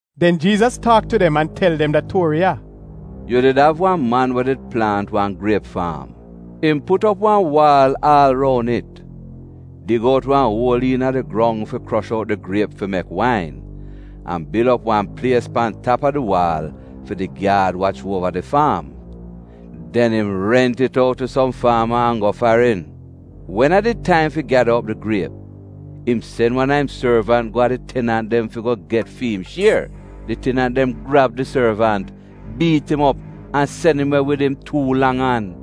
Den Jiizas taak tu dem an tel dem da tuori ya: “Yu did av wan man we did plaant wan griep faam. Im put op wan waal aal roun it, dig out wan uol iina di grong fi krosh out di griep fi mek wain, an bil op wan plies pan tap a di waal fi di gyaad wach uova di faam. Den im rent it out tu som faama an go farin. Wen a did taim fi gyada op di griep, im sen wan a im sorvant go a di tenant dem fi go get fi im shier. Di tenant dem grab di sorvant, biit im op an sen im we wid im tuu lang an.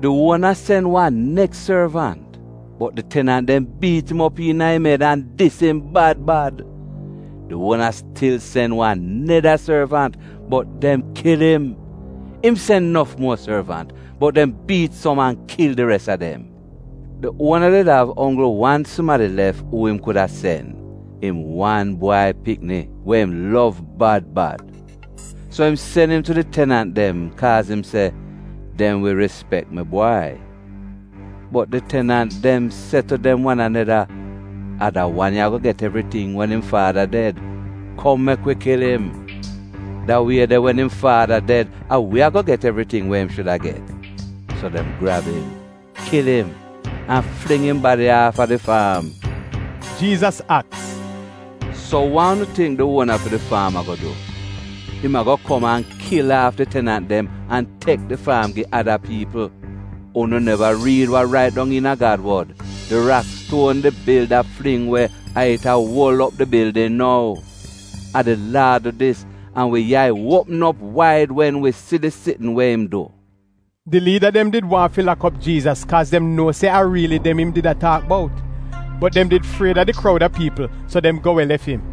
Di uona sen wan neks sorvant, bot di tenant dem biit im op iina im ed an dis im bad bad. Di uona stil sen wan neda sorvant, bot dem kil im. Im sen nof muo sorvant, bot dem biit som an kil di res a dem. “Di uona did av onggl wan sumadi lef uu im kuda sen — im wan bwai pikni we im lov bad bad. So im sen im tu di tenant dem, kaaz im se, ‘Dem wi rispek mi bwai.’ “Bot di tenant dem se tu dem wan aneda, ‘A da wan ya ago get evriting wen im faada ded. Kom mek wi kil im! Da wie de wen im faada ded a wi ago get evriting we im shuda get.’ So dem grab im, kil im, an fling im badi aafa di faam.” Jiizas aks, “So wa unu tingk di uona fi di faam ago du? Im ago kom an kil aaf di tenant dem an tek di faam gi ada piipl. Unu neva riid wa rait dong iina Gad wod, “ ‘Di rakstuon di bilda fling we a it a uol op di bildin nou. A di Laad du dis, an wi yai uopm op waid wen wi si di sitn we im du.’?” Di liida dem did waahn fi lak op Jiizas kaaz dem nuo se a riili dem im did a taak bout. Bot dem did fried a di kroud a piipl, so dem go we lef im.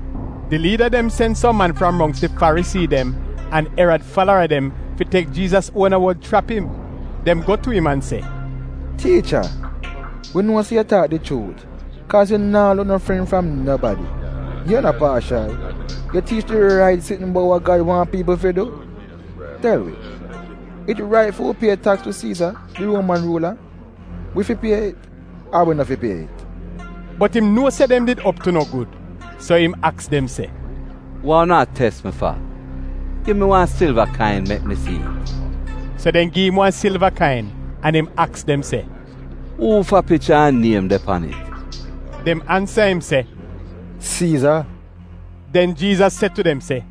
Di liida dem sen som man fram mongks di Farisii dem an Erad falara dem fi tek Jiizas uona wod chrap im. Dem go tu im an se, “Tiicha, wi nuo se yu taak di chuut kaaz yu naa luk no fren fram nobadi. Yu no paashal. Yu tiich di rait sitn bout wa Gad waahn piipl fi du. Tel wi, it rait fi wi pie taks tu Siiza, di Ruoman ruula? Wi fi pie it ar wi no fi pie it?” Bot im nuo se dem did op tu no gud, so im aks dem se, “Wa unu a tes mi fa? Gi mi wan silva kain mek mi si'it!” So dem gi im wan silva kain, an im aks dem se, “Uufa picha an niem de pan it?” Dem ansa im se, “Siiza.” Den Jiizas se tu dem se,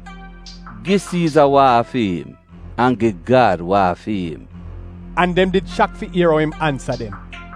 “Gi Siiza wa a fi'im, an gi Gad wa a fi'im.” An dem did shak fi ier ou im ansa dem.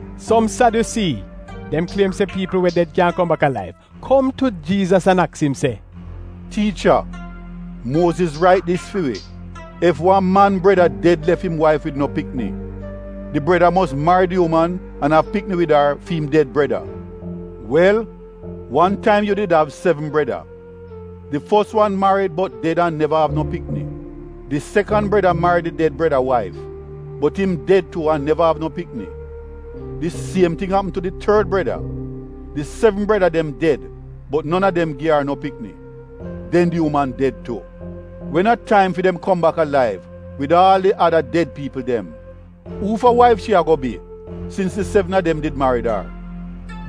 Som Sadyusii (dem kliem se piipl we ded kyaahn kom bak alaiv) kom tu Jiizas an aks im se, “Tiicha, Muoziz rait dis fi wi, ‘Ef wan man breda ded lef im waif wid no pikni, di breda mos marid di uman an av pikni wid ar fi'im ded breda.’ Wel, wan taim yu did av sevn breda. Di fos wan marid bot ded an neva av no pikni. Di sekan breda marid di ded breda waif, bot im ded tu an neva av no pikni. Di siem ting apm tu di tord breda. Di sevn breda dem ded bot non a dem gi ar no pikni. Den di uman ded tu. Wen a taim fi dem kom bak alaiv wid aal di ada ded piipl dem, uufa waif shi ago bi sins di sevn a dem did marid?”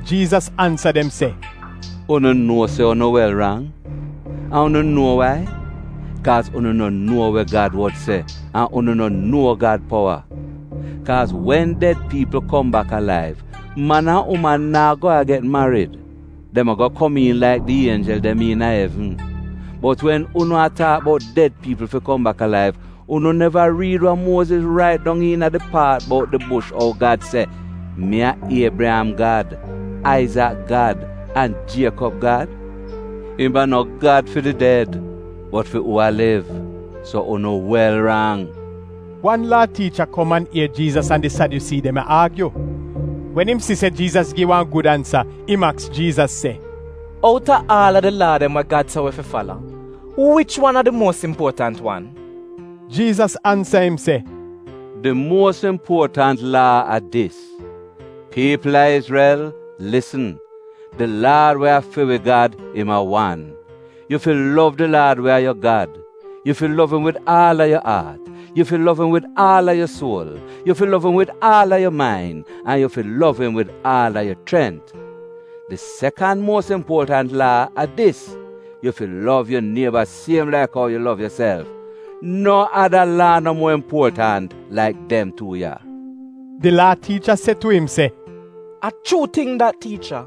Jiizas ansa dem se, “Unu nuo se unu wel rang? An unu nuo wai? Kaaz unu no nuo we Gad wod se, an unu no nuo Gad powa. Kaaz wen ded piipl kom bak alaiv, man an uman naa go a get marid, dem ago komiin laik di ienjel dem iina evn. Bot wen unu a taak bout ded piipl fi kom bak alaiv, unu neva riid wa Muoziz rait dong iina di paat bout di bush ou Gad se, ‘Mi a Iebriyam Gad, Aizak Gad, an Jiekob Gad’? Im a no Gad fi di ded, bot fi uu a liv. So unu wel rang.” Wan Laa tiicha kom an ier Jiizas an di Sadyusii dem a aagyu. Wen im si se Jiizas gi dem wan gud ansa, im aks Jiizas se, “Outa aal a di Laa dem we Gad se wi fi fala, wich wan a di muos impuotant wan?” Jiizas ansa im se, “Di muos impuotant Laa a dis: ‘Piipl a Izrel, lisn, di Laad we a fi wi Gad, im a wan. Yu fi lov di Laad we a yu Gad. Yu fi lov im wid aal a yu aat, yu fi lov im wid aal a yu suol, yu fi lov im wid aal a yu main, an yu fi lov im wid aal a yu chrent.’ Di sekan muos impuotant Laa a dis: ‘Yu fi lov yu nieba siem laik ou yu lov yuself.’ No ada Laa no muo impuotant laik dem tuu ya.” Di Laa tiicha se tu im se, “A chuu ting dat, tiicha.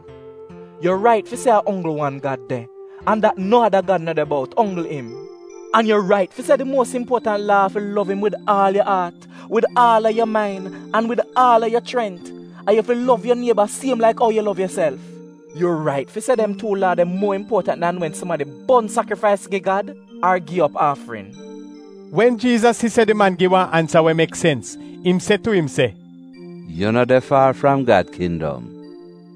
Yu rait fi se a onggl wan Gad de, an dat no ada gad no de bout, onggl im. An yu rait fi se di muos impuotant Laa a fi lov im wid aal yu aat, wid aal a yu main an wid aal a yu chrent, an yu fi lov yu nieba siem laik ou yu lov yuself. Yu rait fi se dem tuu laa de muo impuotant dan wen sumadi bon sakrifais gi Gad ar gi op aafrin.” Wen Jiizas si se di man gi wa ansa we mek sens, im se tu im se, “Yu no de faar fram Gad kindom.”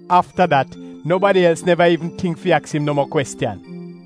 Afta dat nobadi els neva iivn tingk fi aks im no muo kwestiyan.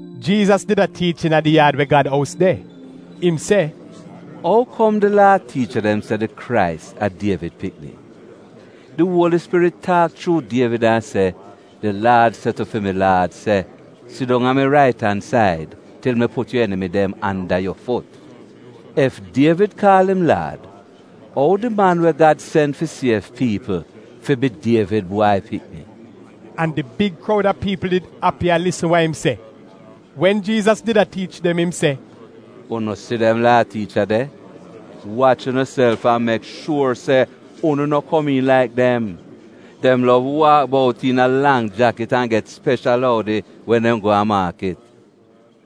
Jiizas did a tiich iina di yaad we Gad ous de. Im se, “Ou kom di Laa tiicha dem se di Krais a Dievid pikni? Di Uoli Spirit taak chuu Dievid an se: “ ‘Di Laad se tu fi mi Laad se: “Sidong a mi rait an said til mi put yu enimi dem anda yu fut.” ’ Ef Dievid kaal im ‘Laad’, ou di Man We Gad sen fi siev piipl fi bi Dievid bwai pikni?” An di big kroud a piipl did api a lisn wa im se. Wen Jiizas did a tiich dem im se, “Unu si dem Laa tiicha de, wach unuself an mek shuor se unu no komiin laik dem! Dem lov waak bout iina lang jakit an get speshal oudi wen dem go a maakit.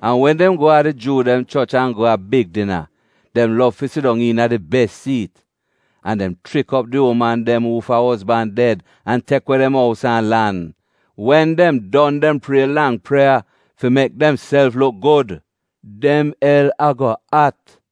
An wen dem go a di Juu dem choch an go a big dina, dem lov fi sidong iina di bes siit. An dem chrik op di uman dem uufa ozban ded an tek we dem ous an lan, wen dem don dem prie lang prieya fi mek demself luk gud. Dem el ago at.”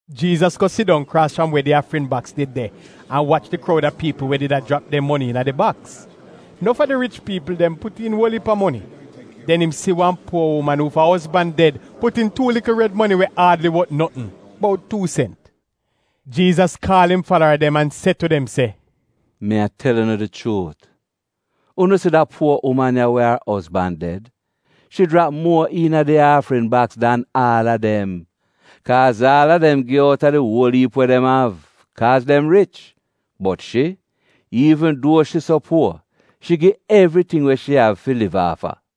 Jiizas go sidong kraas fram we di aafrin baks did de an wach di kroud a piipl we did a jrap dem moni iina di baks. Nof a di rich piipl dem put iin uol iip a moni. Den im si wan puo uman uufa ozban ded put iin tuu likl red moni we aadli wot notn — bout tuu sent. Jiizas kaal im falara dem an se tu dem se, “Mi a tel unu di chuut, unu si da puo uman ya we ar ozban ded, shi jrap muo iina di aafrin baks dan aal a dem. Kaaz aal a dem gi outa di uol iip we dem av, kaaz dem rich. Bot shi, iivn duo shi so puor, shi gi evriting we shi av fi liv aafa.”